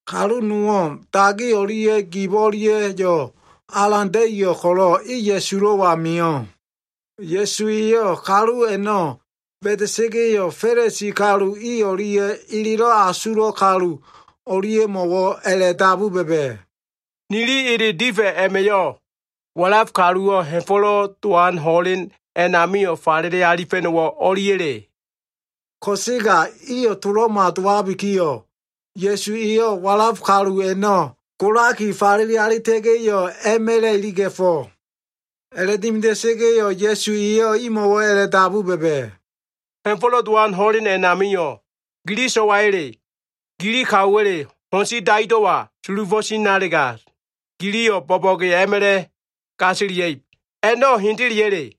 Kalu nowo꞉ dagi o꞉lia꞉ gib o꞉lia꞉yo꞉ alan da꞉iyo꞉ ko꞉lo꞉ e Ya꞉sulo꞉wa mio꞉. Ya꞉su eyo꞉ kalu a꞉no꞉ ba꞉da꞉sa꞉ga꞉yo꞉, Fa꞉lisi kalu i o꞉lia꞉ elelo꞉ asulo꞉ kalu o꞉lia꞉mo꞉wo꞉ a꞉la꞉dabu ba꞉ba꞉, “Nili ele difa꞉ a꞉ma꞉yo꞉, walaf kaluwo꞉ Ha꞉fo꞉lo꞉ Dowan ho꞉len a꞉namio꞉ falele alifa꞉no꞉wo꞉ o꞉liya꞉le?” Ko꞉sega iyo꞉ to꞉lo꞉ma dowabikiyo꞉, Ya꞉su eyo꞉ walaf kalu a꞉no꞉ golaki falele alita꞉ga꞉yo꞉, a꞉ma꞉la꞉ iliga꞉fo꞉. A꞉la꞉dimida꞉sa꞉ga꞉yo꞉ Ya꞉su eyo꞉ imo꞉wo꞉ a꞉la꞉dabu ba꞉ba꞉, “Ha꞉fo꞉lo꞉ Dowan ho꞉len a꞉namio꞉ gili so꞉waya꞉le, gili kaowa꞉le ho꞉n si daido꞉wa sulufo꞉ tinalega, giliyo꞉ bo꞉bo꞉ge a꞉ma꞉la꞉ gasilia꞉ib. A꞉no꞉ hendeleya꞉le?”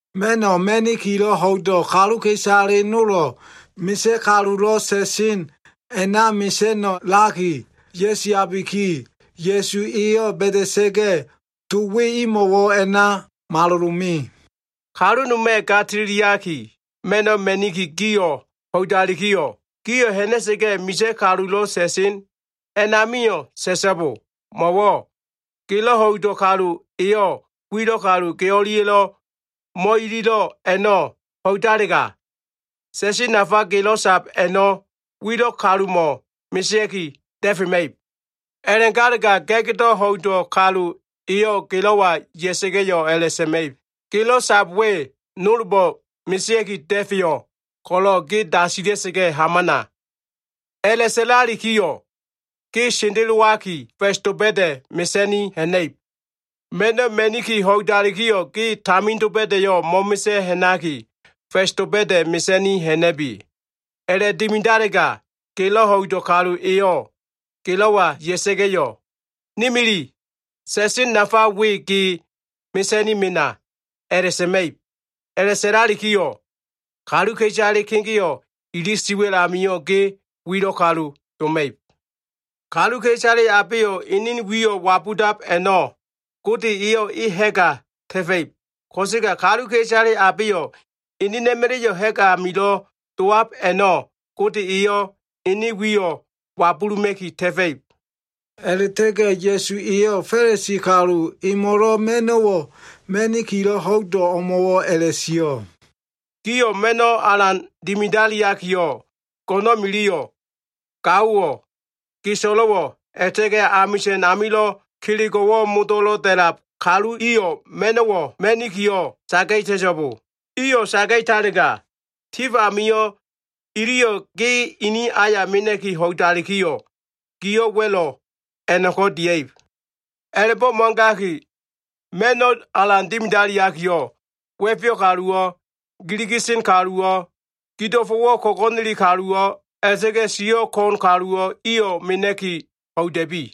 Ma꞉no꞉ ma꞉nikilo꞉ ho꞉ido꞉ kaluka꞉isale nolo꞉ misa꞉ kalulo꞉ sa꞉sen a꞉na mesa꞉no꞉laki ya꞉siabiki, Ya꞉su eyo꞉ ba꞉da꞉sa꞉ga꞉, to we imo꞉wo꞉ a꞉na malolo꞉ me. “Kalu noma꞉ ga tililiaki ma꞉no꞉ ma꞉niki gio꞉ ho꞉idalikiyo꞉, gio꞉ ha꞉na꞉sa꞉ga꞉, misa꞉ kalulo꞉ sa꞉sen a꞉namio꞉ sa꞉so꞉bo. Mo꞉wo꞉ gelo꞉ ho꞉ido꞉ kalu eyo꞉ wilo꞉ kalu ge o꞉lia꞉lo꞉ mo꞉ililo꞉ a꞉no꞉ ho꞉idalega, sa꞉sen nafa gelo꞉ sab a꞉no꞉ wilo꞉ kalumo꞉ mesea꞉ki da꞉fema꞉ib. A꞉la꞉galega ga꞉gdo꞉ ho꞉ido꞉ kalu eyo꞉ gelo꞉wa ya꞉sa꞉ga꞉yo꞉ a꞉la꞉sa꞉ma꞉ib, ‘Gelo꞉ sab we nolbo꞉ mesea꞉ki da꞉feyo꞉ ko꞉lo꞉ ge dasilia꞉ hamana.’ A꞉la꞉sa꞉lalikiyo꞉, ge sendelowaki, fa꞉s doba꞉da꞉ mesa꞉ni ha꞉na꞉ib. Ma꞉no꞉ ma꞉niki ho꞉idalikiyo꞉, ge tamin doba꞉da꞉yo꞉ mo꞉mesa꞉ ha꞉naki, fa꞉s doba꞉da꞉ mesa꞉ni ha꞉na꞉bi. A꞉la꞉dimidalega, gelo꞉ ho꞉ido꞉ kalu eyo꞉ gelo꞉wa ya꞉sa꞉ga꞉yo꞉, ‘Ni mili, sa꞉sen nafa we ge mesa꞉ni mena’ a꞉la꞉sa꞉ma꞉ib. A꞉la꞉sa꞉lalikiyo꞉, kaluka꞉isale kegeo꞉ ili siwa꞉l amio꞉, ge wilo꞉ kalu doma꞉ib. Kaluka꞉isale abeyo꞉ enen wiyo꞉ wabudab a꞉no꞉, Gode eyo꞉ e ha꞉ga ta꞉fa꞉ib. Ko꞉sega kaluka꞉isale abeyo꞉ enena꞉ma꞉la꞉yo꞉ ha꞉g amilo꞉ dowab a꞉no꞉, Gode eyo꞉ ene wiyo꞉ wabuluma꞉ki ta꞉fa꞉ib.” A꞉la꞉ta꞉ga꞉ Ya꞉su eyo꞉ Fa꞉lisi kalu emo꞉lo꞉ ma꞉no꞉wo꞉ ma꞉nikilo꞉ ho꞉ido꞉ o꞉mo꞉wo꞉ a꞉la꞉sio꞉, “Giyo꞉ ma꞉no꞉ alan dimidaliakiyo꞉, go꞉no꞉n miliyo꞉, gaowo꞉, ge so꞉lo꞉wo꞉, a꞉la꞉ta꞉ga꞉ amisa꞉n amilo꞉ kelego꞉wo꞉ modo꞉lo꞉ da꞉lab kalu iyo꞉ ma꞉no꞉wo꞉ mena꞉kiyo꞉ saga꞉ta꞉so꞉bo. Iyo꞉ saga꞉talega, tif amio꞉ iliyo꞉ ge ini aya mena꞉ki ho꞉idalikiyo꞉, giyo꞉ wa꞉lo꞉ a꞉no꞉ko꞉ dia꞉ib. A꞉la꞉bo꞉ mo꞉gaki, ma꞉no꞉ alan dimidaliakiyo꞉, wa꞉feyo꞉ kaluwo꞉, giligi sen kaluwo꞉, gido꞉fo꞉wo꞉ ko꞉go꞉neli kaluwo꞉, a꞉la꞉ta꞉ga꞉ siyo꞉ ko꞉n kaluwo꞉ iyo꞉ mena꞉ki ho꞉ida꞉bi.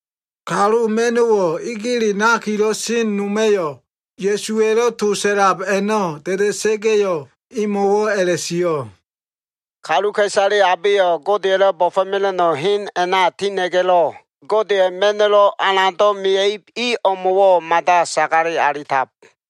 Kalu ma꞉no꞉wo꞉ egele nakilo꞉ sen noma꞉yo꞉ Ya꞉suwa꞉lo꞉ to sa꞉lab a꞉no꞉ da꞉da꞉sa꞉ga꞉yo꞉, emo꞉wo꞉ a꞉la꞉sio꞉, “Kaluka꞉isale abeyo꞉ Godeya꞉lo꞉ bo꞉fo꞉mela꞉no꞉ hen a꞉na tina꞉ga꞉lo꞉ Godeya꞉ ma꞉no꞉ alando꞉ ma꞉ib i o꞉mo꞉wo꞉ mada sagale alitab.”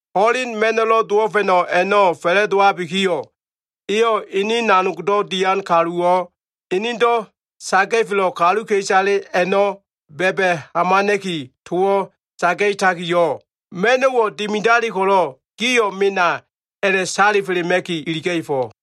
Ho꞉len ma꞉no꞉lo꞉ dowo꞉fa꞉no꞉ a꞉no꞉ fa꞉la꞉dowabikiyo꞉, eyo꞉ ene nanogdo꞉ dian kaluwo꞉ enedo꞉ saga꞉felo꞉ kaluka꞉isale a꞉no꞉ ba꞉ba꞉ hamana꞉ki, towo꞉ saga꞉takiyo꞉, ‘Ma꞉no꞉wo꞉ dimidali ko꞉lo꞉ gio꞉ mena’ a꞉la꞉ salifelema꞉ki iliga꞉fo꞉.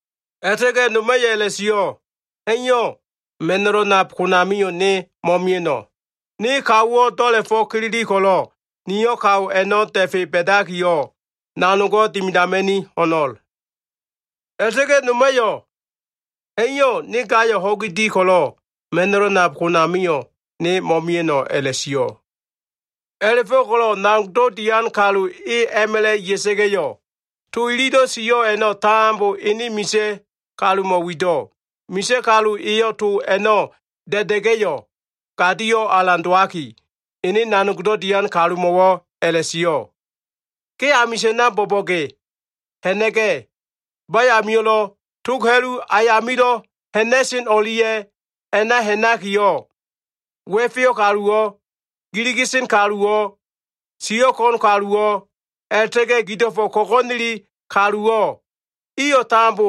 A꞉la꞉ta꞉ga꞉ noma꞉yo꞉ a꞉la꞉sio꞉, ‘Ha꞉iyo꞉, ma꞉no꞉lo꞉ nab konamio꞉ ne mo꞉mia꞉no꞉. Ne kaowo꞉ do꞉la꞉fo꞉ kilili ko꞉lo꞉, niyo꞉ kao a꞉no꞉ da꞉fe ba꞉dakiyo꞉, nanogo꞉ dimidama꞉ni ho꞉no꞉l.’ A꞉la꞉ta꞉ga꞉ noma꞉yo꞉, ‘Ha꞉iyo꞉, ne gayo꞉ ho꞉gi di ko꞉lo꞉, ma꞉no꞉lo꞉ nab konamio꞉ ne mo꞉mia꞉no꞉’ a꞉la꞉sio꞉. “A꞉la꞉fo꞉ko꞉lo꞉ nanogdo꞉ dian kalu e a꞉ma꞉la꞉ ya꞉sa꞉ga꞉yo꞉, to ililo꞉ sio꞉ a꞉no꞉ tambo ene misa꞉ kalumo꞉ wido꞉. Misa꞉ kalu eyo꞉ to a꞉no꞉ da꞉da꞉ga꞉yo꞉, gadio꞉ alan dowaki, ene nanogdo꞉ dian kalumo꞉wo꞉ a꞉la꞉sio꞉, ‘Ge amisa꞉na bo꞉bo꞉ge ha꞉na꞉ga꞉, bayamio꞉lo꞉, tog ha꞉lu ayamilo꞉ ha꞉na꞉sen o꞉lia꞉ ana ha꞉nakiyo꞉, wa꞉feyo꞉ kaluwo꞉, giligi sen kaluwo꞉, siyo꞉ ko꞉n kaluwo꞉, a꞉la꞉ta꞉ga꞉ gido꞉fo꞉ ko꞉go꞉neli kaluwo꞉, iyo꞉ tambo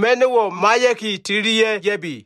ma꞉no꞉wo꞉ maiya꞉ki tililia꞉ ya꞉bi.’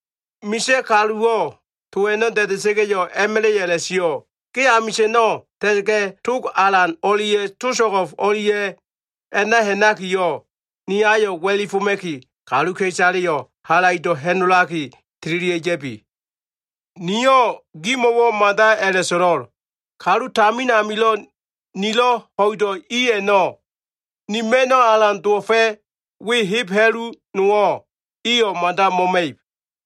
Misa꞉ kaluwo꞉ to a꞉no꞉ da꞉da꞉sa꞉ga꞉yo꞉, a꞉ma꞉la꞉yo꞉ a꞉la꞉sio꞉, ‘Ge amisa꞉na ta꞉ta꞉ga꞉, tog alan o꞉lia꞉ to so꞉go꞉f o꞉lia꞉ a꞉na ha꞉nakiyo꞉, ni ayo꞉ wa꞉lifoma꞉kiyo꞉, kaluka꞉isalemo꞉wo꞉ halaido꞉ sa꞉lakiyo꞉ ha꞉nola꞉la꞉ga꞉ tililia꞉ ya꞉bi. Niyo꞉ gimo꞉wo꞉ mada a꞉la꞉so꞉lo꞉l. Kalu tamin amilo꞉ nilo꞉ ho꞉ido꞉ i a꞉no꞉, ni ma꞉no꞉ alan dowo꞉fa꞉ we heb ha꞉lu nowo꞉ iyo꞉ mada mo꞉ma꞉ib.’”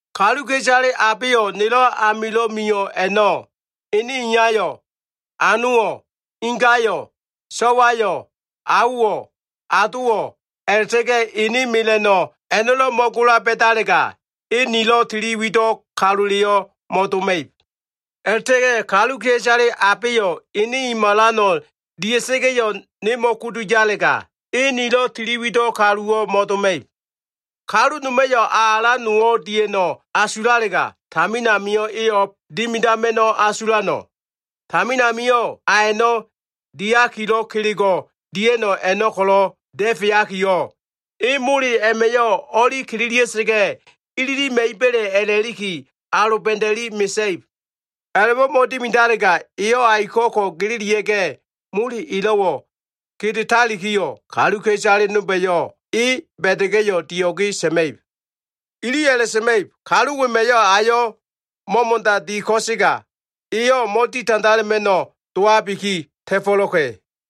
“Kaluka꞉isale abeyo꞉ nelo꞉ amilo꞉ mio꞉ a꞉no꞉, ene iyayo꞉, anowo꞉, ingayo꞉, so꞉wayo꞉, aowo꞉, adowo꞉, a꞉la꞉ta꞉ga꞉ ene mela꞉no꞉ a꞉no꞉lo꞉ mo꞉gola ba꞉dalega, e nilo꞉ tili wido꞉ kaluleyo꞉ mo꞉doma꞉ib. A꞉la꞉ta꞉ga꞉ kaluka꞉isale abeyo꞉ ene i malano꞉ dia꞉sa꞉ga꞉yo꞉, ne mo꞉kudu yalega, e nilo꞉ tili wido꞉ kaluwo꞉ mo꞉doma꞉ib. “Kalu noma꞉yo꞉ a alan nowo꞉ dia꞉no꞉ asulalega, tamin amio꞉ e o꞉b dimidama꞉no꞉ asulano꞉? Tamin amio꞉ a a꞉no꞉ diakilo꞉ kelego꞉ dia꞉no꞉ a꞉no꞉ ko꞉lo꞉ da꞉feakiyo꞉, e mole a꞉ma꞉yo꞉ o꞉li kililia꞉sa꞉ga꞉ ililima꞉iba꞉le a꞉la꞉liki aloba꞉da꞉li mesa꞉ib. A꞉la꞉bo꞉ mo꞉dimidalega, eyo꞉ aiko꞉ ko gililia꞉ga꞉, mole elo꞉wo꞉ kedetalikiyo꞉, kaluka꞉isale nolba꞉yo꞉ e ba꞉da꞉ga꞉yo꞉, dio꞉ge sa꞉ma꞉ib. Iliyo꞉ a꞉la꞉sa꞉ma꞉ib, ‘Kalu wema꞉yo꞉ ayo꞉ mo꞉mo꞉da di ko꞉sega, eyo꞉ mo꞉ditandala꞉ma꞉no꞉ dowabiki ta꞉fo꞉lo꞉ka꞉.’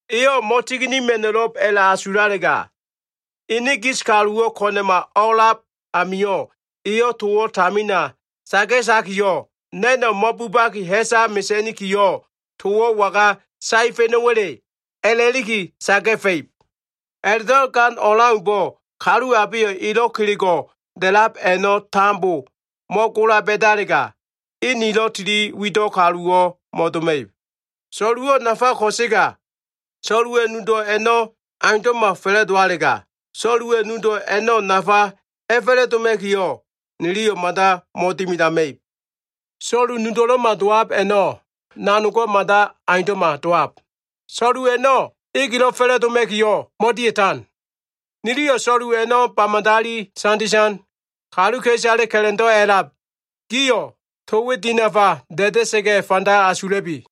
Eyo꞉ mo꞉tiginima꞉no꞉lo꞉b a꞉la꞉asulalega, ene gis kaluwo꞉ ko꞉na꞉ o꞉a꞉lab amio꞉, eyo꞉ towo꞉ tamina saga꞉takiyo꞉, ‘Na꞉no꞉ mo꞉bubaki ha꞉sa mesa꞉nikiyo꞉, towo꞉ waga saefa꞉no꞉wa꞉le?’ a꞉la꞉liki saga꞉fa꞉ib. A꞉la꞉do꞉ gan o꞉leaumbo꞉, kalu abeyo꞉ elo꞉ kelego꞉ da꞉lab a꞉no꞉ tambo mo꞉gola ba꞉dalega, e nilo꞉ tili wido꞉ kaluwo꞉ mo꞉doma꞉ib. “So꞉luwo꞉ nafa ko꞉sega, so꞉luwa꞉ nudo꞉ a꞉no꞉ aundo꞉ma fa꞉la꞉dowalega, so꞉luwa꞉ nudo꞉ a꞉no꞉ nafa a꞉fa꞉la꞉doma꞉kiyo꞉, niliyo꞉ mada mo꞉dimidama꞉ib. So꞉lu nudo꞉lo꞉ma dowab a꞉no꞉ nanogo꞉ mada aundo꞉ma dowab. So꞉lu a꞉no꞉ egelo꞉ fa꞉la꞉doma꞉kiyo꞉ mo꞉dia꞉tan. Niliyo꞉ so꞉lu a꞉no꞉ ba madali sanditan. Kaluka꞉isale ka꞉la꞉ndo꞉ a꞉lab gio꞉, to we dinafa da꞉da꞉sa꞉ga꞉ fanda asula꞉bi.”